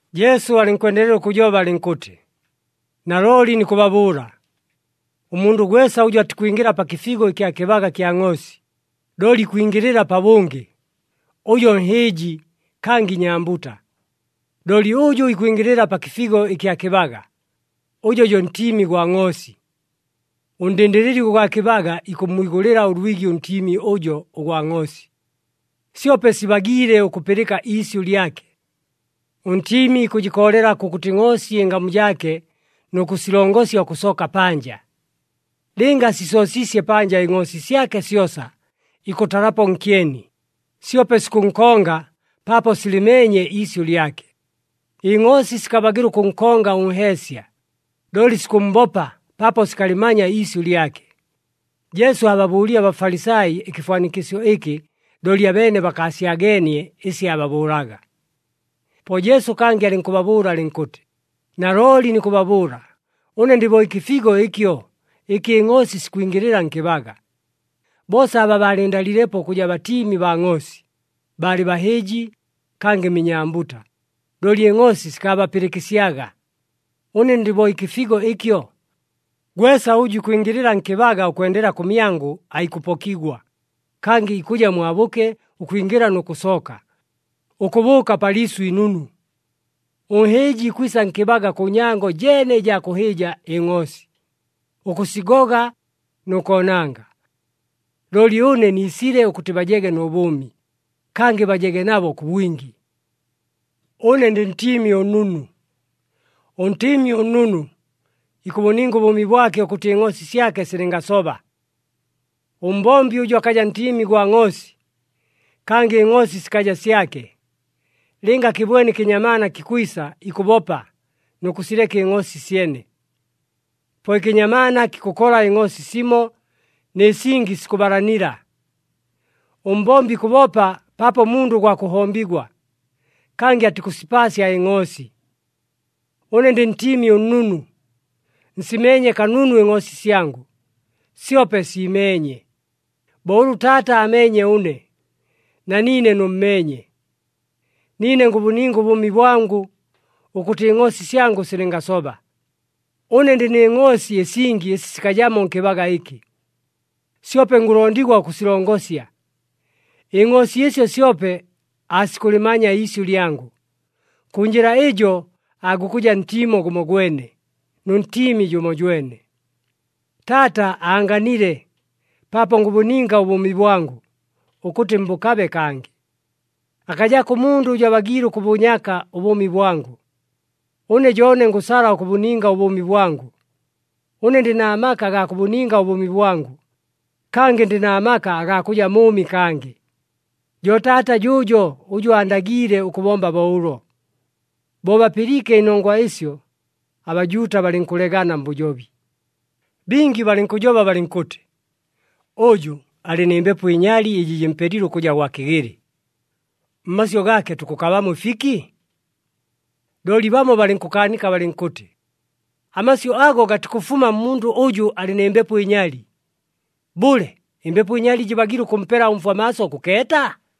Jesu alɨnkwendelela ʉkʉjoba alɨnkʉtɨ, “Nalooli nikʉbabʉʉla, ʉmundʉ gwesa ʉjʉ atikwingɨla pa kɨfigo ɨkya kɨbaga kya ngʼoosi, looli ikwingɨlɨla pabʉngɨ, ʉjo nhɨɨji kangɨ inyambuta. Looli ʉjʉ ikwingɨlɨla pa kɨfigo ɨkya kɨbaga, ʉjo jo ntiimi gwa ngʼoosi. Ʉndɨndɨlɨli ʉgwa kɨbaga ikʉmmwigʉlɨla ʉlwigi ʉntiimi ʉjo ʉgwa ngʼoosi. Syope sibagiile ʉkʉpɨlɨka iisyʉ lyake. Ʉntiimi ikʉjɨkoolela kʉkʉtɨ ngʼoosi ɨngamu jaake nʉ kʉsilongosya ʉkʉsooka panja. Lɨnga asisoosiisye panja ɨngʼoosi syake syosa, ikʉtalapo nkyeni, syope sikʉnkonga paapo silɨmeenye iisyʉ lyake. Ɨngʼoosi sikabagɨla ʉkʉnkonga ʉnheesya, looli sikʉmmbopa paapo sikalɨmanya iisyʉ lyake.” Jesu aababʉʉlile aBafalisai ɨkɨfwanikɨsyo ɨkɨ, looli abeene bakaasyageenie ɨsi aababʉʉlaga. Po Jesu kangɨ alɨnkʉbabʉʉla alɨnkʉtɨ, “Nalooli nikʉbabʉʉla, ʉne ndɨ bo ɨkɨfigo ɨkyo, ɨkɨ ɨngʼoosi sikwingɨlɨla nkɨbaga. Boosa aba baalɨndaliilepo ʉkʉja batiimi baa ngʼoosi, baalɨ bahɨɨji kangɨ minyambuta, looli ɨngʼoosi sikaabapɨlɨkɨsyaga. Ʉne ndɨ bo ɨkɨfigo ɨkyo. Gwesa ʉjʉ ikwingɨlɨla nkɨbaga ʉkwendela kʉmyangʉ aikʉpokigwa, kangɨ ikʉja mwabʉke ʉkwingɨla nʉ kʉsooka, ʉkʉbʉʉka pa liisʉ inunu. Ʉnhɨɨji ikwisa nkɨbaga kʉ nyango jeene ɨjaa kʉhɨɨja ɨngʼoosi, ʉkʉsigoga nʉ koonanga. Looli ʉne niisile ʉkʉtɨ bajege nʉ bʉʉmi, kangɨ bajege nabo kʉ bwingi. “Ʉne ndɨ Ntiimi ʉNnunu. ɄNtiimi ʉNnunu, ikʉbʉninga ʉbʉʉmi bwake, ʉkʉtɨ ɨngʼoosi syake silɨngasoba. Ʉmbombi ʉjʉ akaja ntiimi gwa ngʼoosi, kangɨ ɨngʼoosi sikaja syake, lɨnga akɨbwene ɨkɨnyamaana kikwisa, ikʉbopa nʉ kʉsileka ɨngʼoosi syene. Po ɨkɨnyamaana kikʉkola ɨngʼoosi simo, nɨ singi sikʉbalanila. Ʉmbombi ikʉbopa paapo mundʉ gwa kʉhombigwa, kangɨ atikʉsipaasya ɨngʼoosi. Ʉne ndɨ Ntiimi ʉNnunu. Nsimeenye kanunu ɨngʼoosi syangʉ, syope siimeenye, bo ʉlʉ Taata aameenye ʉne, na niine nʉmmeenye. Niine ngʉbʉninga ʉbʉʉmi bwangʉ, ʉkʉtɨ ɨngʼoosi syangʉ silɨngasoba. Ʉne ndɨ nɨ ngʼoosi ɨsingi ɨsi sikajamo nkɨbaga ɨkɨ, syope ngʉlondigwa ʉkʉsilongosya. Ɨngʼoosi ɨsyo syope aasikʉlɨmanya iisyʉ lyangʉ. Kʉ njɨla ɨjo, aagukʉja ntiimo gʉmogwene, nʉ Ntiimi jʉmojwene. “Taata aanganile, paapo ngʉbʉninga ʉbʉʉmi bwangʉ, ʉkʉtɨ mbʉkabe kangɨ. Akajako ʉmundʉ ʉjʉ abagiile ʉkʉbʉnyaka ʉbʉʉmi bwangʉ. Ʉne jo ʉne ngʉsala ʉkʉbʉninga ʉbʉʉmi bwangʉ. Ʉne ndɨ na maka agaa kʉbʉninga ʉbʉʉmi bwangʉ, kangɨ ndɨ na maka agaa kʉja mʉʉmi kangɨ. Jo Taata jʉʉjo ʉjʉ aandagiile ʉkʉbomba bo ʉlo.” Bo bapɨliike ɨnongwa ɨsyo, aBajuuta balɨnkʉlegana mbʉjobi. Bingi balɨnkʉjoba balɨnkʉtɨ, “Ʉjʉ alɨ nɨ mbepo ɨnyali, ɨjɨ jɨmpelile ʉkʉja gwa kɨgɨlɨ. Mmasyʉ gaake tukʉkabamo ɨfiki?” Looli bamo balɨnkʉkaanika balɨnkʉtɨ, “Amasyʉ ago gatikʉfuma mmundʉ ʉjʉ alɨ nɨ mbepo ɨnyali. Bʉle, ɨmbepo ɨnyali jɨbagiile ʉkʉmpela ʉmfwa maaso ʉkʉkeeta?”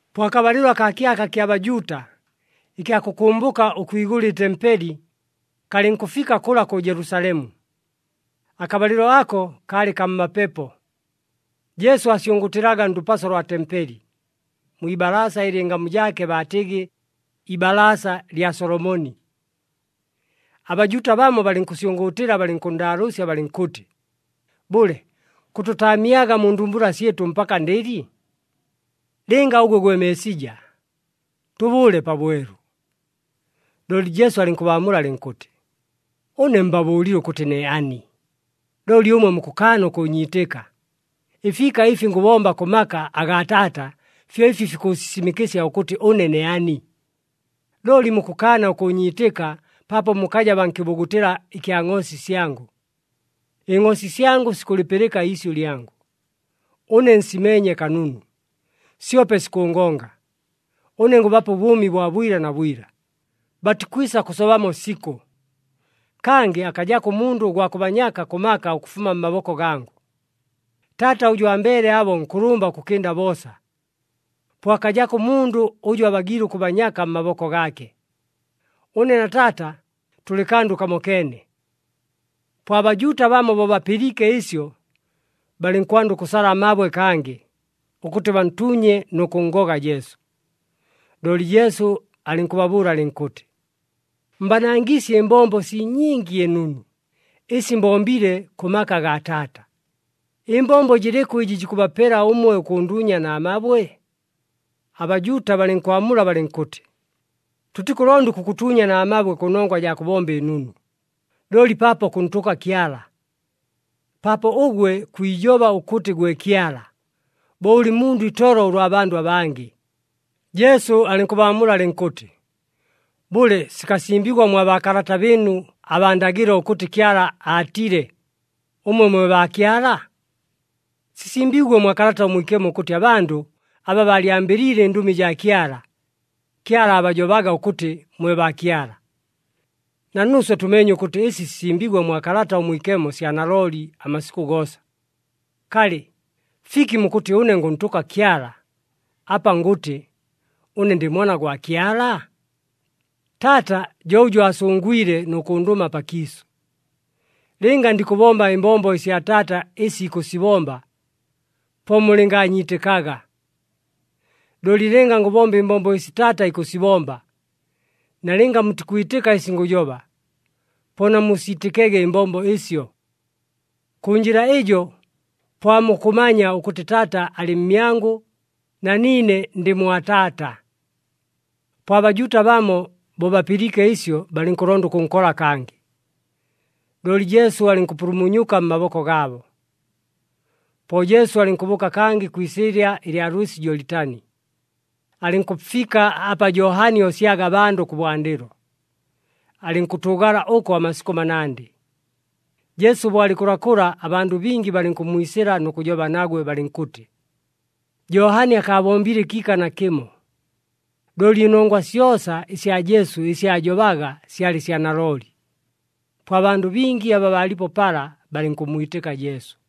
Po akabalɨlo akaa kyaka kya Bajuuta, ɨkya kʉkʉmbʉka ʉkwigʉla ɨtempeli, kalɨnkʉfika kʉla kʉ Jelusalemu. Akabalɨlo ako kaalɨ kaa mmapepo. Jesu aasyʉngʉʉtɨlaga ndʉpaso lwa tempeli, mwi ibalaasa ɨlɨ ɨngamu jaake baatɨgɨ, iBalaasa lya Solomoni. ABajuuta bamo balɨnkʉnsyʉngʉʉtɨla balɨnkʉnndaalʉʉsya balɨnkʉtɨ, “Bʉle, kʉtʉtaamyaga mu ndumbula syɨtʉ mpaka ndɨli? Lɨnga ʉgwe gwe Meesija, tʉbʉʉle pabwelu.” Looli Jesu alɨnkʉbaamula alɨnkʉtɨ, “Ʉne mbabʉʉlile ʉkʉtɨ ne ani, looli ʉmwe mukʉkaana ʉkʉʉnyiitɨka. Ɨfiika ɨfi ngʉbomba kʉ maka agaa Taata fyo ɨfi fikʉʉsisimɨkɨsya ʉkʉtɨ ʉne ne ani. “Looli mukʉkaana ʉkʉʉnyiitɨka paapo mukaja baa nkɨbugutɨla ɨkya ngʼoosi syangʉ. Ɨngʼoosi syangʉ sikʉlɨpɨlɨka iisyʉ lyangʉ. Ʉne nsimeenye kanunu, syope sikʉngonga. Ʉne ngʉbapa ʉbʉʉmi bwa bwila na bwila, batikwisa kʉsobamo sikʉ. Kangɨ akajako ʉmundʉ ʉgwa kʉbanyaka kʉ maka ʉkʉfuma mmaboko gangʉ. Taata ʉjʉ ambeele abo nkʉlʉmba ʉkʉkɨnda boosa. Po akajako ʉmundʉ ʉjʉ abagiile ʉkʉbanyaka mmaboko gaake. Ʉne na Taata tʉlɨ kandʉ kamokeene.” Po aBajuuta bamo bo bapɨliike ɨsyo, balɨnkwanda ʉkʉsala amabwe kangɨ, ʉkʉtɨ bantuunye nʉ kʉnngoga Jesu. Looli Jesu alɨnkʉbabʉʉla alɨnkʉtɨ, “Mbanangiisye ɨmbombo sii nyingi ɨnunu, ɨsi mbombile kʉ maka agaa Taata. Ɨmbombo jɨlɨkʉ ɨjɨ jikʉbapela ʉmwe ʉkʉnduunya na mabwe?” ABajuuta balɨnkwamula balɨnkʉtɨ, “Tʉtikʉlonda ʉkʉkʉtuunya na mabwe kʉnongwa jaa kʉbomba ɨnunu, looli paapo kʉntʉka Kyala. Paapo ʉgwe kwijoba ʉkʉtɨ gwe Kyala, bo ʉlɨ mundʉ itolo ʉlwa abandʉ abangɨ!” Jesu alɨnkʉbaamula alɨnkʉtɨ, “Bʉle, sikasimbigwa mwa baakalata bɨɨnu abaa ndagɨlo ʉkʉtɨ Kyala aatile, ‘Ʉmwe mwe baakyala’? Sisimbiigwe mwa Kalata ʉMwikemo ʉkʉtɨ abandʉ aba baalyambɨliile ɨndʉmi jaa Kyala, Kyala aabajobaga ʉkʉtɨ mwe baakyala. Na nuuswe tʉmeenye ʉkʉtɨ ɨsi sisimbiigwe mwa Kalata ʉMwikemo sya nalooli amasikʉ goosa. Kalɨ, fiki mukʉtɨ ʉne ngʉntʉka Kyala, apa ngʉtɨ, ‘Ʉne ndɨ Mwana gwa Kyala’? Taata jo ʉjʉ aasʉngwile nʉ kʉndʉma pakiisʉ. Lɨnga ndikʉbomba ɨmbombo ɨsya Taata ɨsi ikʉsibomba, po mulɨngaanyiitɨkaga. Looli lɨnga ngʉbomba ɨmbombo ɨsi Taata ikʉsibomba, nalɨnga mutikwitɨka ɨsi ngʉjoba, po namusiitɨkege ɨmbombo ɨsyo. Kʉ njɨla ɨjo, po aamukʉmanya ʉkʉtɨ Taata alɨ mmyangʉ, na niine ndɨ mwa Taata.” Po aBajuuta bamo bo bapɨliike ɨsyo, balɨnkʉlonda ʉkʉnkola kangɨ, looli Jesu alɨnkʉpulumunyuka mmaboko gaabo. Po Jesu alɨnkʉbʉʉka kangɨ kwi isɨɨlya ɨlya lwɨsi Jolitani, alɨnkʉfika apa Johani oosyaga abandʉ kʉbwandɨlo, alɨnkʉtʉʉgala ʉko amasikʉ manandɨ. Jesu bo alɨ kʉlakʉla, abandʉ bingi balɨnkʉmmwisɨla nʉ kʉjoba nagwe balɨnkʉtɨ, “Johani akaabombile ɨkiika nakɨmo, looli ɨnongwa syosa ɨsya Jesu ɨsi aajobaga syalɨ sya nalooli.” Po abandʉ bingi aba baalipo pala balɨnkʉmmwitɨka Jesu.